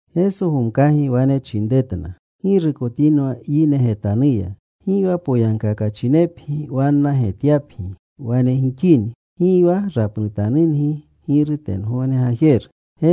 Geso gomkagi wane chinretna, “Ggirukotinwa yine getanuya. Gi wa poyagkakachinepgi wanna getyapgi. Wane gixini, gi wa rapnutanungi Giru tengogne Gajeru.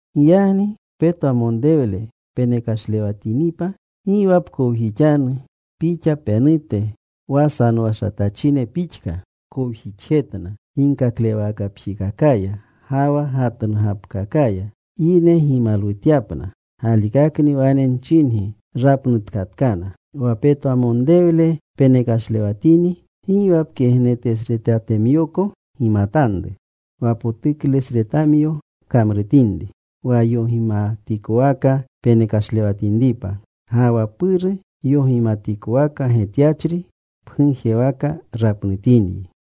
“Giyagni petwamonrewle penekashlewatinipa, gi wa pkowjixanu pixa penute, wa sanowashatachine pixka kowjixjetna ginkaklewakapjikakaya ga wa gatnugapkakaya, yine gimalwutyapna. Galikakni wane nchingi rapnutkatkana. Wa petwamonrewle peneklewashatini, gi wa pkegnetesretatemyoko gimatanru wa potuklesretatemyo pkamrutinri, wa yogimatikowaka penekashlewatinripa. Ga wa Puru, yogimatikowaka getyachri, pgujewaka rapnutinyi.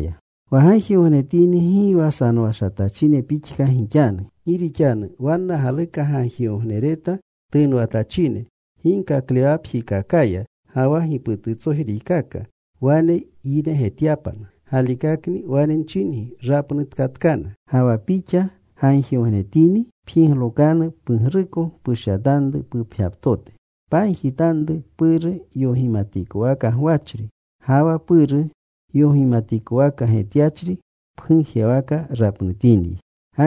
“Wa gagjigognetini gi wa sanowashatachine pixka gixanu. Gi rixanu wanna galuka gagjigognereta tunwatachine ginkaklewakapjikakaya ga wa gipututsojriykaka, wa yine getyapna. Galikakni wane nchingi, rapnutkatkana. Ga wa pixa gagjigognetini, pjiglokanu pugruko. Pushyatanru pupgyaptote. Pagjitanru Puru yogimatikowaka gwachri. Ga wa Puru yogimatikowaka getyachri pgujewaka rapnutinyi.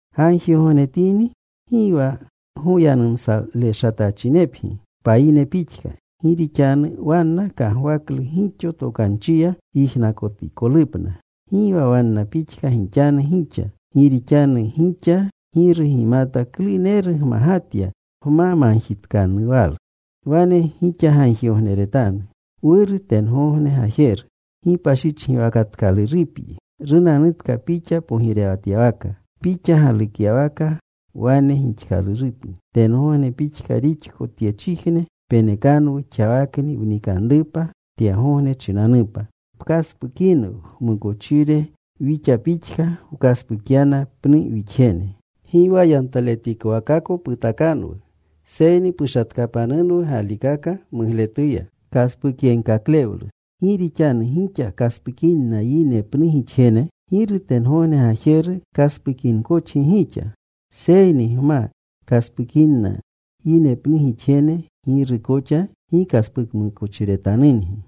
“Gagjigognetini gi wa goyanumsaleshatachinepgi payine pixka. Gi rixanu wanna kagwaklu gixo tokanchiya yijnakotikolupna. Gi wa wanna pixka gixanu gixa. Gi rixanu gixa Giru gimata kluneru gmagatya gma magjitkanuwalu. “Wane gixa gagjigogneretanu: Wuru, tengogne Gajeru, gipashichgiwakatkalurupyi. Runanutka Pixa pogirewatyawaka. Pixa galukyawaka wane gixkalurupni; tengogneko pixka rixko tyechijne. Penekanwu xawakni wnikanrupa tyegogne chinanupa. Pkaspukinwu wmukochire wixa pixka wkaspukyana pnu wixjene. Gi wa yantaletikowakako putakanwu, seyni pushatkapanunwu galikaka mugletuya. “Gi rixanu gixa kaspukinna yine pnu gixjene, Giru tengogne gajeru, kaspukinkoxgi gixa. Seyni gma kaspukinna yine pnu gixjene, Giru koxa gi kaspukmukochiretanungi.”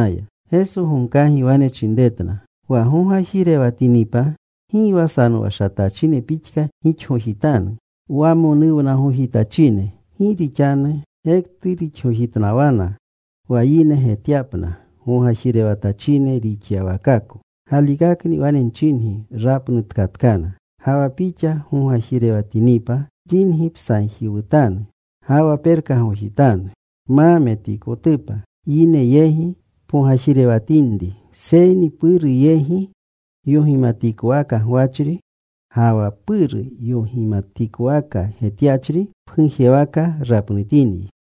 Geso gomkagi wane chinretna, “Wa gogajirewatinipa gi wa sanowashatachine pixka gixgojitanu wamonuwnagojitachine. Gi rixanu gektu rixgojitnawana wa yine getyapna gogajirewatachine gixyawakako. Galikakni wane nchingi rapnutkatkana. Ga wa pixa gogajirewatinipa, ringi psagjiwutanu, ga wa perkagojitanu. Pma metikotupa yine yegi wa pogajirewatinri, seyni Puru yegi yogimatikowaka gwachri. Ga wa Puru yogimatikowaka getyachri pgujewaka rapnutinyi.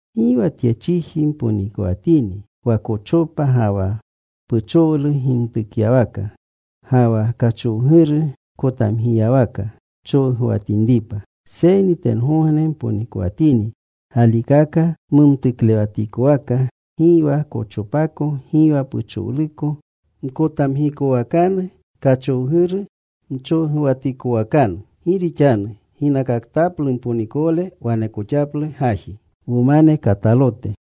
“Gi wa tye chiji mponikowatini, wa kochopa ga wa puchowlu gimtukyawaka, ga wa kachowguru kotamgiyawaka, chowguwatinripa. Seyni tengogne mponikowatini galikaka, mumtuklewatikowaka gi wa kochopako, gi wa puchowluko, mkotamgikowakanu kachowguru, mchowguwatikowakanu. Gi rixanu ginakaktaplu mponikowle wanekoxaplu gaji.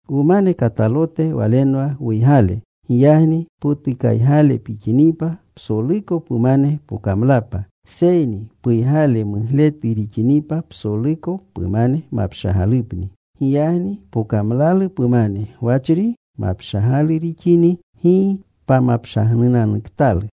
“Wumane katalote walenwa wuygale. Giyagni potukaygale pixinipa, psoluko pumane pokamlapa. Seyni puygale mugletu rixinipa, psoluko pumane mapshagalupni. Giyagni pokamlalu pumane gwachri mapshagalu rixini, ¡gi pamapshagnunanuktalu!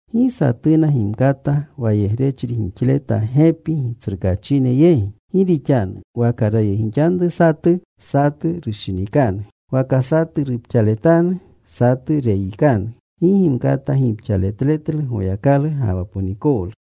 “Gi satuna gimkata wayegrechri gixleta gepi gitsrukaachine yegi. Gi rixanu waka rayegixanru satu, satu rushinikanu. Waka satu rupxaletanu, satu reyikanu. Gi gimkata gipxaletletlu Goyakalu ga wa ponikowlu.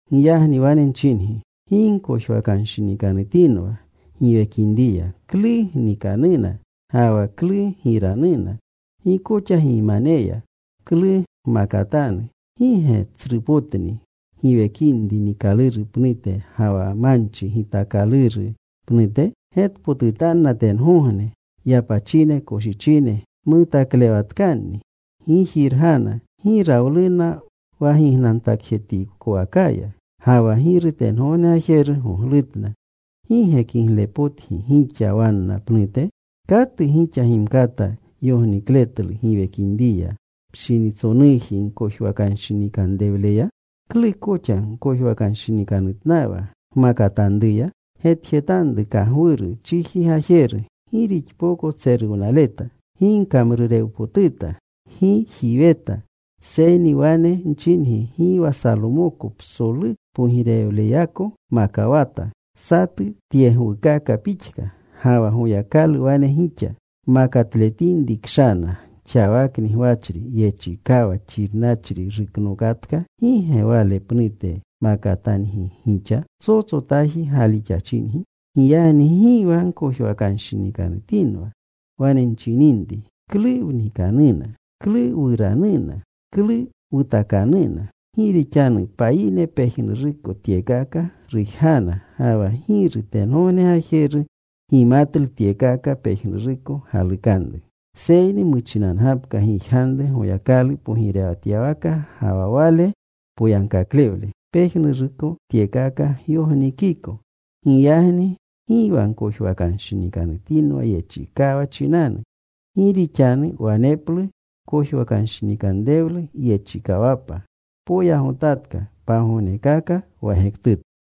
“Giyagni wane nchingi, gi gkojwakanshinikanutinwa giwekinriya, klu gnikanuna ga wa klu giranuna. Gi koxa gimaneya, klu gmakatanu. ¿Gi ge tsrupotni giwekinri niikaluru pnute, ga wa manchi gitaakaluru pnute? Getpotutanna tengogne yapachine koshichine mutaklewatkanni. Gi jirgana. Gi rawluna wa gignantakjetikwakaya. Ga wa Giru tengogne Gajeru goglutna. ¿Gi ge kiglepotgi gixa wanna pnute? ¿Katu gixa gimkata yognikletlu giwekinriya pshinitsonuji gkojwakanshinkanrewleya? “¿Klu koxa gkojwakanshinikanutnawa gmakatanruya? Getjetanru kagwuru chiji gajeru, gi rixpoko tseruwnaleta. Gi kamrurewpotuta. Gi jiweta. Seyni wane nchingi gi wa Salomoko psolu pogirewleyako makawata satu tyegwukaka pixka. Ga wa Goyakalu wane gixa makatletinri kshana xawakni gwachri, yechikawa xirnachri ruknookonatka, ¿gi ge wale pnute makatangi gixa? Psotsotaji galixachingi. Giyagni gi wa gkojwakanshinikanutinwa, wane nchininri, ‘¿Klu wnikanuna? ¿Klu wuranuna? ¿Klu wutakanuna?’ Gi rixanu payine pejnuruko tyekaka rujgana. Ga wa Giru tengogne Gajeru gimatlu tyekaka pejnuruko galukanru. Seyni muchinanu gapka gijganru Goyakalu pogirewatyawaka, ga wa Wale poyagkaklewle. Pejnuruko tyekaka gyognikiko. Giyagni gi wa gkojwakanshinikanutinwa yechikawa chinanu. Gi rixanu waneplu kojwakanshinikanrewlu yechikawapa. Poyagotatka pagognekaka wa gektutu.”